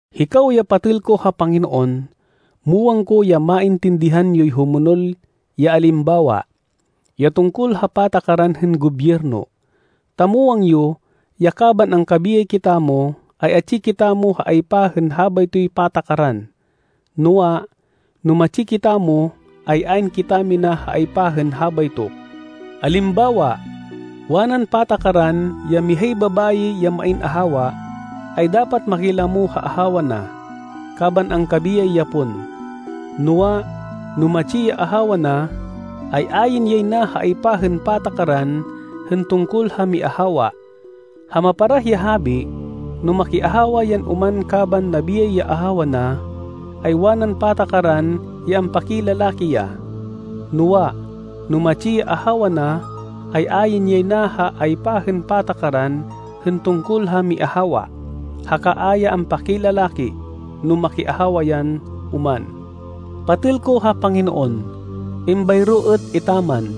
Hikaw ya patêl ko ha Panginoon, muwang ko ya maintindihan yoy humonol ya alimbawa, ya tungkol ha patakaran hên gobyerno, ta muwang yo ya kaban angkabiyay kitamo, ay atsi kitamo ha aypa hên habaytoy patakaran. Noa, no matsi kitamo, ay ayn kitamina ha aypa hên habayto. Alimbawa, wanan patakaran ya mihay babayi ya main ahawa, ay dapat makilamo ha ahawa na, kaban angkabiyay ya pon. Noa, no matsi ya ahawa na, ay ayn yay na ha aypa hên patakaran hên tungkol ha miahawa. Ha maparah ya habi, no makiahawa yan oman kaban nabiyay ya ahawa na, ay wanan patakaran ya ampakilalaki ya. Noa, no matsi ya ahawa na, ay ayn yay na ha aypa hên patakaran hên tungkol ha miahawa, haka a ya ampakilalaki no makiahawa yan oman. Patêl ko ha Panginoon, êmbayro êt etaman,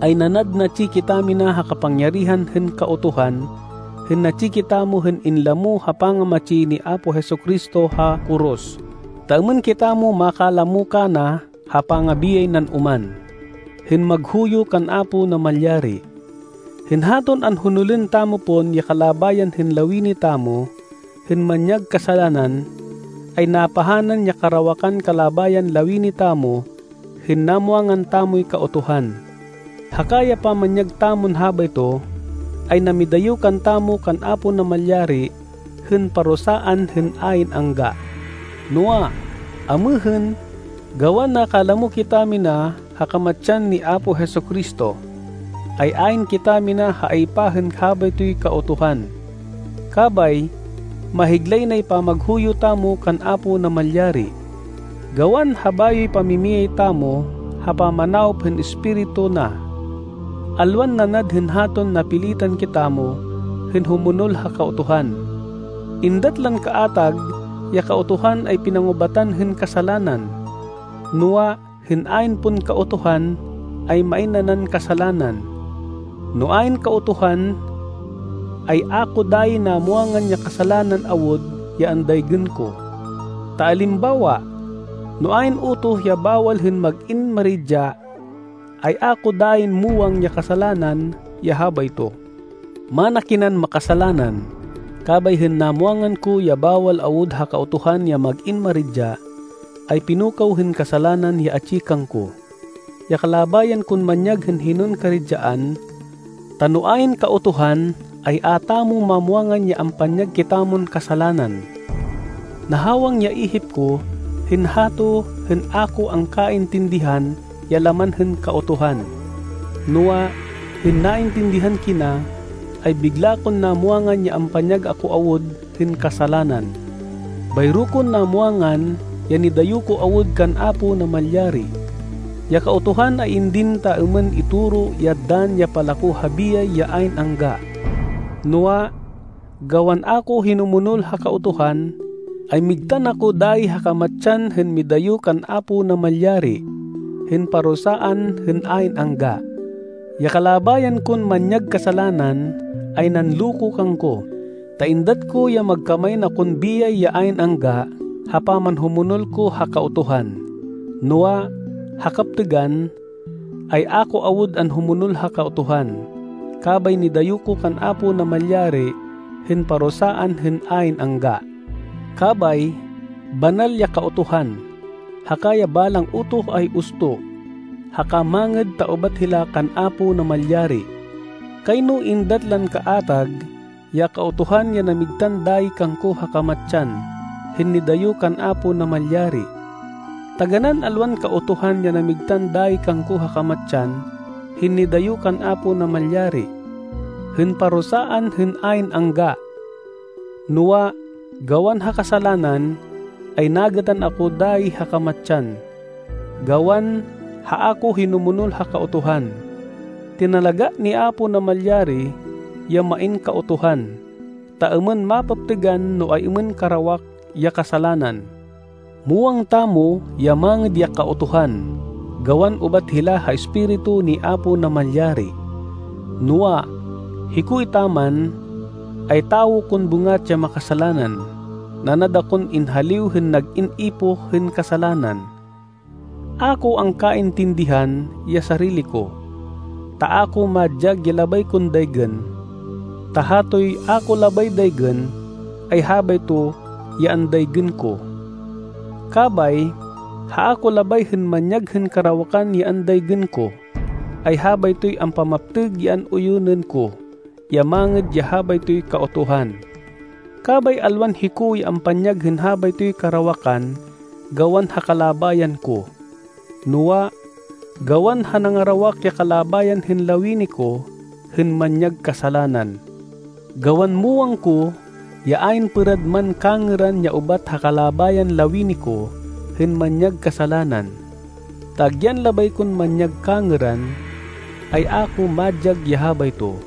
ay nanad natsi kitamina ha kapangyarihan hên Kautuhan hên natsi kitamo hên inlamo ha pangamatsi ni Apo Jesu-Cristo ha koros, ta êmên kitamo makalamo kana ha pangabiyay nan oman, hên maghuyo kan Apo Namalyari. Hên haton anhonolên tamo pon ya kalabayan hên lawini tamo hên manyag kasalanan, ay napahanan ya karawakan kalabayan lawini tamo hên namwangan tamoy Kautuhan. Haka ya pamanyag tamon habayto, ay namidayo kantamo kan Apo Namalyari hên parusaan hên ayn angga. Noa, amêhên, gawan nakalamo kitamina ha kamatsan ni Apo Jesu-Cristo, ay ayn kitamina ha aypa hên habaytoy Kautuhan. Kabay mahiglay nay pamaghuyo tamo kan Apo Namalyari, gawan ha bayoy pamimiyay tamo ha pamanawop hên Espiritu na, alwan nanad hên haton napilitan kitamo hên humonol ha Kautuhan. Êndat lan kaatag ya Kautuhan ay pinangubatan hên kasalanan. Noa, hên ayn pon Kautuhan, ay main nanan kasalanan. No ayn Kautuhan, ay a ko dayi namwangan ya kasalanan awud ya andaygên ko. Ta alimbawa, no ayn utoh ya bawal hên mag-in maridya, ay a ko dayin muwang ya kasalanan ya habayto. Mana kinan makasalanan kabay hên namwangan ko ya bawal awud ha Kautuhan ya mag-in maridya, ay pinukaw hên kasalanan ya atsi kangko, ya kalabayan kon manyag hên hinon karidyaan. Ta no ayn Kautuhan, ay a tamo mamwangan ya ampanyag kitamon kasalanan. Nahawang ya ihip ko hên hato hên a ko angkaintindihan ya laman hên Kautuhan. Noa, hên naintindihan kina, ay bigla kon namwangan ya ampanyag ako awud hên kasalanan. Bayro kon namwangan ya nidayo ko awud kan Apo Namalyari. Ya Kautuhan ay indin ta êmên itoro ya dann ya palako ha biyay ya ayn angga. Noa, gawan a ko hinumonol ha Kautuhan, ay migtan ako dayi ha kamatsan hên midayo kan Apo Namalyari, hên parusaan hên ayn angga. Ya kalabayan kon manyag kasalanan ay nanloko kangko, ta êndat ko ya magkamain akon biyay ya ayn angga ha pamanhumonol ko ha Kautuhan. Noa, ha kaptêgan, ay a ko awud anhumonol ha Kautuhan, kabay nidayo ko kan Apo Namalyari hên parusaan hên ayn angga. Kabay, banal ya Kautuhan, haka ya balang utoh ay usto haka mangêd ta ubat hila kan Apo Namalyari. Kayno êndat lan kaatag ya Kautuhan ya namigtan dayi kangko ha kamatsan, hên nidayo kan Apo Namalyari. Taganán alwan Kautuhan ya namigtan dayi kangko ha kamatsan hên nidayo kan Apo Namalyari, hên parusaan hên ayn angga. Noa, gawan ha kasalanan, ay nagêtan ako dayi ha kamatsan, gawan ha a ko hinumonol ha Kautuhan. Tinalagá ni Apo Namalyari ya main Kautuhan, ta êmên mapaptêgan no ay-êmên karawak ya kasalanan. Muwang tamo ya mangêd ya Kautuhan gawan ubat hila ha Espiritu ni Apo Namalyari. Noa, hiko etaman, ay tawo kon bêngat ya makasalanan. Nanad akon inhaliw hên nag-in ipoh hên kasalanan. A ko angkaintindihan ya sarili ko. Ta a ko madyag ya labay kon daygên. Ta hatoy a ko labay daygên, ay habayto ya andaygên ko. Kabay ha a ko labay hên manyag hên karawakan ya andaygên ko, ay habaytoy ampamaptêg ya an-uyunên ko ya mangêd ya habaytoy Kautuhan. Kabay alwan hiko ya ampanyag hên habaytoy karawakan gawan ha kalabayan ko, noa, gawan ha nangarawak ya kalabayan hên lawini ko hên manyag kasalanan. Gawan muwang ko ya ayn pêrad man kangêran ya ubat ha kalabayan lawini ko hên manyag kasalanan, ta agyan labay kon manyag kangêran, ay a ko madyag ya habayto.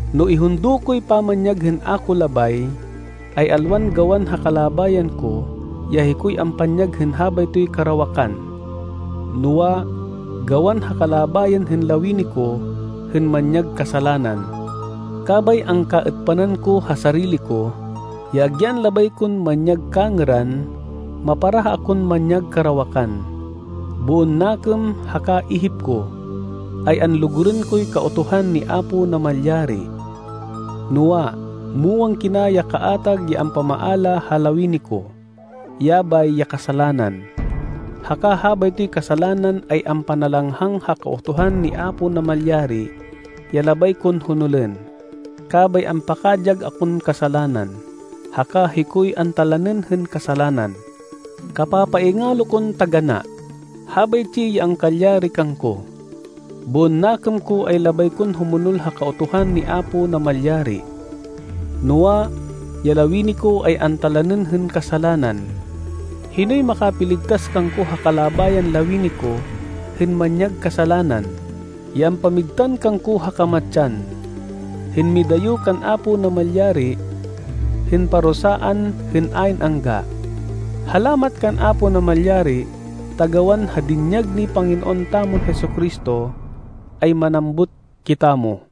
No ihundo koy pamanyag hên a ko labay, ay alwan gawan ha kalabayan ko ya hikoy ampanyag hên habaytoy karawakan, noa, gawan ha kalabayan hên lawini ko hên manyag kasalanan. Kabay angkaêtpanan ko ha sarili ko, ya agyan labay kon manyag kangêran, maparah akon manyag karawakan. Boon nakêm haka ihip ko, ay anlugurên koy Kautuhan ni Apo Namalyari, noa, muwang kina ya kaatag ya ampamaala ha lawini ko. Yabay ya kasalanan, haka habaytoy kasalanan ay ampanalanghang ha Kautuhan ni Apo Namalyari ya labay kon honolên, kabay ampakadyag akon kasalanan, haka hikoy antalanên hên kasalanan. Kapapaingalo kon taganá! Habaytsi ya angkalyari kangko. Boon nakêm ko ay labay kon humonol ha Kautuhan ni Apo Namalyari, noa, ya lawini ko ay antalanên hên kasalanan. Hinoy makapiligtas kangko ha kalabayan lawini ko hên manyag kasalanan, ya ampamigtan kangko ha kamatsan, hên midayo kan Apo Namalyari, hên parusaan hên ayn angga? Halamat kan Apo Namalyari ta gawan ha dinyag ni Panginoon tamon Jesu-Cristo, ay manambut kitamo!